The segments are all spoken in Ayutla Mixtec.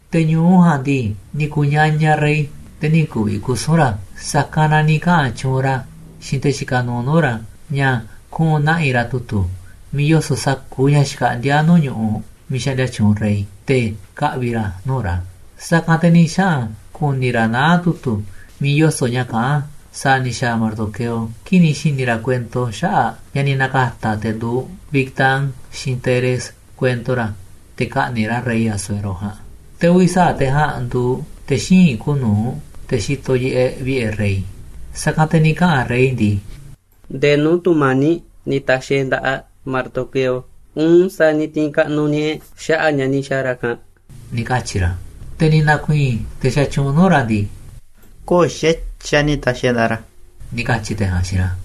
Te̱ ñu̱u ja̱a̱nꞌ ndii, ni̱ ku̱ñañaꞌ rey, te̱ nï̱ ku̱vi̱ kusu̱n ra̱. Sa̱kanꞌ na ni̱ kaꞌa̱n tyuunꞌ ra̱ xiinꞌ te̱ xikaꞌ nuuꞌ nuu̱ꞌ ra̱ ña̱ kuꞌu̱n na̱ꞌi̱ ra̱ tu̱tu̱ miiꞌ yoso̱ꞌ sa̱kuuꞌ ña̱ xkaꞌndíá nuu̱ꞌ ñu̱ꞌuꞌ miiꞌ xaꞌndia tyuunꞌ rey, te̱ ka̱ꞌvi̱ ra̱ a̱ nuu̱ꞌ ra̱. Sa̱kanꞌ te̱ ni̱ xaꞌa̱n ku̱ni̱ ra̱ naá tu̱tu̱ miiꞌ yoso̱ꞌ ña̱ kaꞌán sa̱a̱ ni̱ xa̱a̱ Mardoqueo kii̱ꞌ ni̱ xi̱ni̱ ra̱ kuento xaꞌa̱ꞌ ña̱ ni̱ na̱ka̱ta̱ te̱ nduuꞌ Bigtán xiinꞌ Teres kuento ra̱ te̱ ka̱ꞌni̱ꞌ ra̱ rey Asuero ja̱a̱nꞌ. Te̱ uvi̱ sa̱aꞌ te̱ ja̱a̱nꞌ nduuꞌ te̱ xíinꞌ kuuꞌ nu̱uꞌ, te̱ xitoꞌ yiꞌeꞌ vi̱ꞌe̱ rey. Sa̱kanꞌ te̱ ni̱ kaꞌa̱n rey ndii: ―¿Ndee nuu̱ꞌ tu̱mani̱ꞌ ni̱ ta̱xi̱ e̱ꞌ nda̱ꞌaꞌ Mardoqueo, uun sa̱a̱ ni̱ ti̱i̱n kaꞌnuꞌ ña̱ꞌaꞌ e̱ꞌ xaꞌa̱ꞌ ña̱ ni̱ xa̱a̱ ra̱ ja̱a̱nꞌ? ―ni̱ katyi̱ ra̱. Te̱ ni̱ na̱ku̱i̱i̱n te̱ xatyuunꞌ nuu̱ꞌ ra̱ ndii: ―Köo̱ꞌ xa̱tyiꞌ a̱ ni̱ ta̱xi̱ e̱ꞌ nda̱ꞌaꞌ ra̱ ―ni̱ katyi̱ te̱ ja̱a̱nꞌ xiinꞌ ra̱.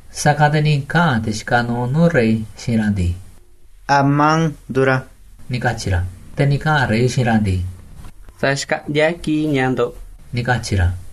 Sa̱kanꞌ te̱ ni̱ kaꞌa̱n te̱ xikaꞌ nuuꞌ nuu̱ꞌ rey xiinꞌ ra̱ ndii: ―Amán nduuꞌ ra̱ ―ni̱ katyi̱ ra̱. Te̱ ni̱ kaꞌa̱n rey xiinꞌ ra̱ ndii: ―Sa̱xkaꞌndi̱a̱ kiꞌi̱ꞌ ña̱ꞌaꞌ ndo̱ꞌ ―ni̱ katyi̱ ra̱.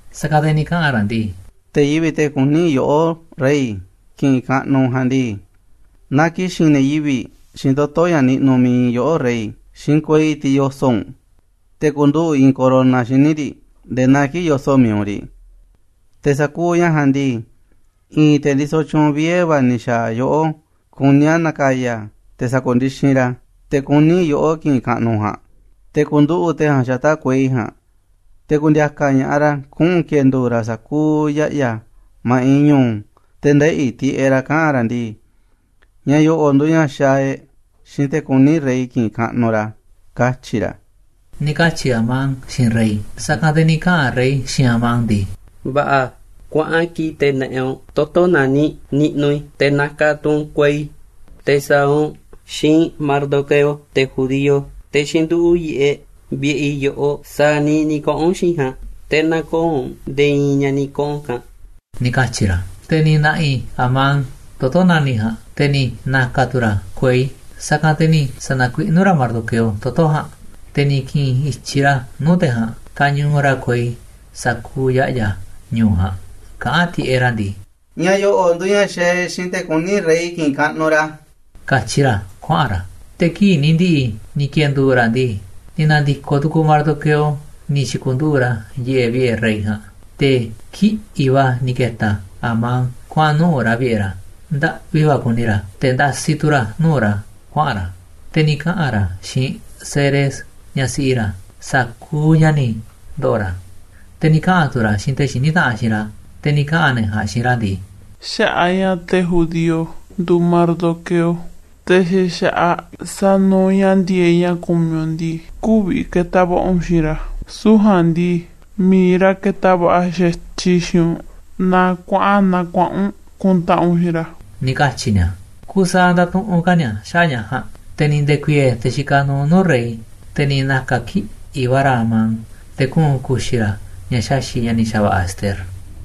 Sa̱kanꞌ te̱ ni̱ kaꞌa̱n ra̱ ndii: ―Te̱ yivi̱ꞌ, te̱ kuní yoꞌó, rey, ki̱ꞌi̱n kaꞌnuꞌ u̱nꞌ ja̱a̱nꞌ ndii, na ki̱xi̱n ne̱ yivi̱ꞌ xiinꞌ toto̱ ña̱ niꞌnuꞌ mi̱iꞌ yoꞌó rey, xiinꞌ kuei, tiꞌ yoso̱ꞌ u̱nꞌ, te̱ ku̱nduꞌu̱ꞌ i̱i̱n corona xíniꞌ riꞌ nde̱e̱ naa kii̱ꞌ yoso̱ꞌ mi̱iꞌ u̱nꞌ riꞌ. Te̱ sa̱kuuꞌ ña̱ ja̱a̱nꞌ ndii, i̱i̱n te̱ ndisoꞌ tyuunꞌ vie̱ va̱ ni̱ xa̱a̱ yoꞌó kuní a̱ na̱ka̱ya̱ a̱ te̱ sa̱ku̱ndixinꞌ ra̱ te̱ kuní yoꞌó ki̱ꞌi̱n kaꞌnuꞌ u̱nꞌ ja̱a̱nꞌ. Te̱ ku̱nduꞌu̱ꞌ te̱ ja̱a̱nꞌ xata̱ꞌ kuei ja̱a̱nꞌ, te̱ ku̱ndi̱a̱ka̱ ña̱ꞌaꞌ ra̱ kuꞌu̱n ki̱e̱ndu̱u̱ ra̱ sa̱kuuꞌ ya̱ꞌya̱ ma̱ꞌiꞌ ñu̱u̱, te̱ ndeꞌi̱ tiꞌeꞌ ra̱ kaꞌa̱n ra̱ ndii: ‘‘Ña̱ yo̱ꞌo̱ꞌ nduuꞌ ña̱ xaaꞌ e̱ꞌ xiinꞌ te̱ kuní rey ki̱ꞌi̱n kaꞌnuꞌ ra̱”, katyi̱ ra̱ ―ni̱ katyi̱ Amán xiinꞌ rey. Sa̱kanꞌ te̱ ni̱ kaꞌa̱n rey xiinꞌ Amán ndii: ―Va̱ꞌa̱, kuaꞌan kii̱ꞌ te̱ na̱ꞌi̱ u̱nꞌ toto̱ nani̱ꞌ niꞌnuꞌ i̱, te̱ na̱ka̱ tu̱ u̱nꞌ kuei, te̱ sa̱a̱ u̱nꞌ xiinꞌ Mardoqueo, te̱ judío, te̱ xínduꞌu̱ꞌ yiꞌeꞌ vi̱ꞌe̱ i̱ yoꞌoꞌ, sa̱a̱ niiꞌ ni̱ kaꞌa̱n u̱nꞌ xiinꞌ i̱ ja̱a̱nꞌ, te̱ nä̱ko̱o̱ u̱nꞌ nde̱e̱ i̱i̱n ña̱ ni̱ kaꞌa̱n u̱nꞌ ja̱a̱nꞌ ―ni̱ katyi̱ ra̱. Te̱ ni̱ na̱ꞌi̱ Amán toto̱ nani̱ꞌ ja̱a̱nꞌ, te̱ ni̱ na̱ka̱ tu̱ ra̱ kuei, sa̱kanꞌ te̱ ni̱ sa̱na̱kuiꞌnú ra̱ Mardoqueo toto̱ ja̱a̱nꞌ, te̱ ni̱ ki̱ꞌi̱n i̱tyiꞌ ra̱ nuu̱ꞌ te̱ ja̱a̱nꞌ kañuuꞌ ra̱ kuei sa̱kuuꞌ ya̱ꞌya̱ ñu̱u̱ ja̱a̱nꞌ kaꞌán tiꞌeꞌ ra̱ ndii: ―Ña̱ yo̱ꞌo̱ꞌ nduuꞌ ña̱ xaaꞌ e̱ꞌ xiinꞌ te̱ kuní rey ki̱ꞌi̱n kaꞌnuꞌ ra̱ ―katyi ra̱ kuaꞌa̱n ra̱. Te̱ kii̱ꞌ ni̱ ndi̱ꞌi̱ ni̱ ki̱e̱ndu̱u̱ ra̱ ndii, ni̱ na̱ndi̱koꞌ tu̱ku̱u̱ Mardoqueo ni̱ xi̱ku̱nduꞌu̱ꞌ ra̱ yiꞌeꞌ vi̱ꞌe̱ rey ja̱a̱nꞌ. Te̱ kiꞌi̱ꞌ va̱ ni̱ ke̱ta̱ Amán kuaꞌa̱n nuꞌu̱ꞌ ra̱ vi̱ꞌe̱ ra̱, ndaꞌvi va̱ kuni ra̱, te̱ ndasi tu̱ ra̱ nuu̱ꞌ ra̱ kuaꞌa̱n ra̱. Te̱ ni̱ kaꞌa̱n ra̱ xiinꞌ Zeres, ñaꞌ siꞌi ra̱, sa̱kuuꞌ ña̱ ni̱ ndo̱ꞌo̱ ra̱, te̱ ni̱ kaꞌa̱n tu̱ ra̱ a̱ xiinꞌ te̱ xiní taꞌanꞌ xiinꞌ ra̱. Te̱ ni̱ kaꞌa̱n ne̱ ja̱a̱nꞌ xiinꞌ ra̱ ndii: ―Xaꞌa̱ꞌ a̱ ña̱ te̱ judío nduuꞌ Mardoqueo, te̱ xa̱ xa̱ꞌaꞌ sanuuꞌ ña̱ ndi̱e̱eꞌ ña̱ kumiꞌ u̱nꞌ ndii, kü̱vi̱ ke̱ta̱ va̱ꞌa̱ u̱nꞌ xiinꞌ ra̱, süu̱ꞌ ja̱a̱nꞌ ndii, mi̱iꞌ ra̱ ke̱ta̱ va̱ꞌa̱ xa̱tyiꞌ xiinꞌ u̱nꞌ naaꞌ kuaꞌa̱n naa kuaꞌa̱n u̱nꞌ kuntaꞌanꞌ u̱nꞌ xiinꞌ ra̱ ―ni̱ katyi̱ nia̱. Kusaaꞌ ndatuꞌunꞌ ka̱ ni̱a̱ xaꞌa̱ꞌ ña̱ ja̱a̱nꞌ, te̱ ni̱ nde̱ku̱i̱e̱e̱ te̱ xikaꞌ nuuꞌ nuu̱ꞌ rey, te̱ ni̱ na̱ka̱ kiꞌi̱ꞌ va̱ ra̱ Amán te̱ kuꞌu̱n ku̱xi̱ ra̱ ña̱ xaxi̱ꞌ ña̱ ni̱ xa̱va̱ꞌa̱ Ester.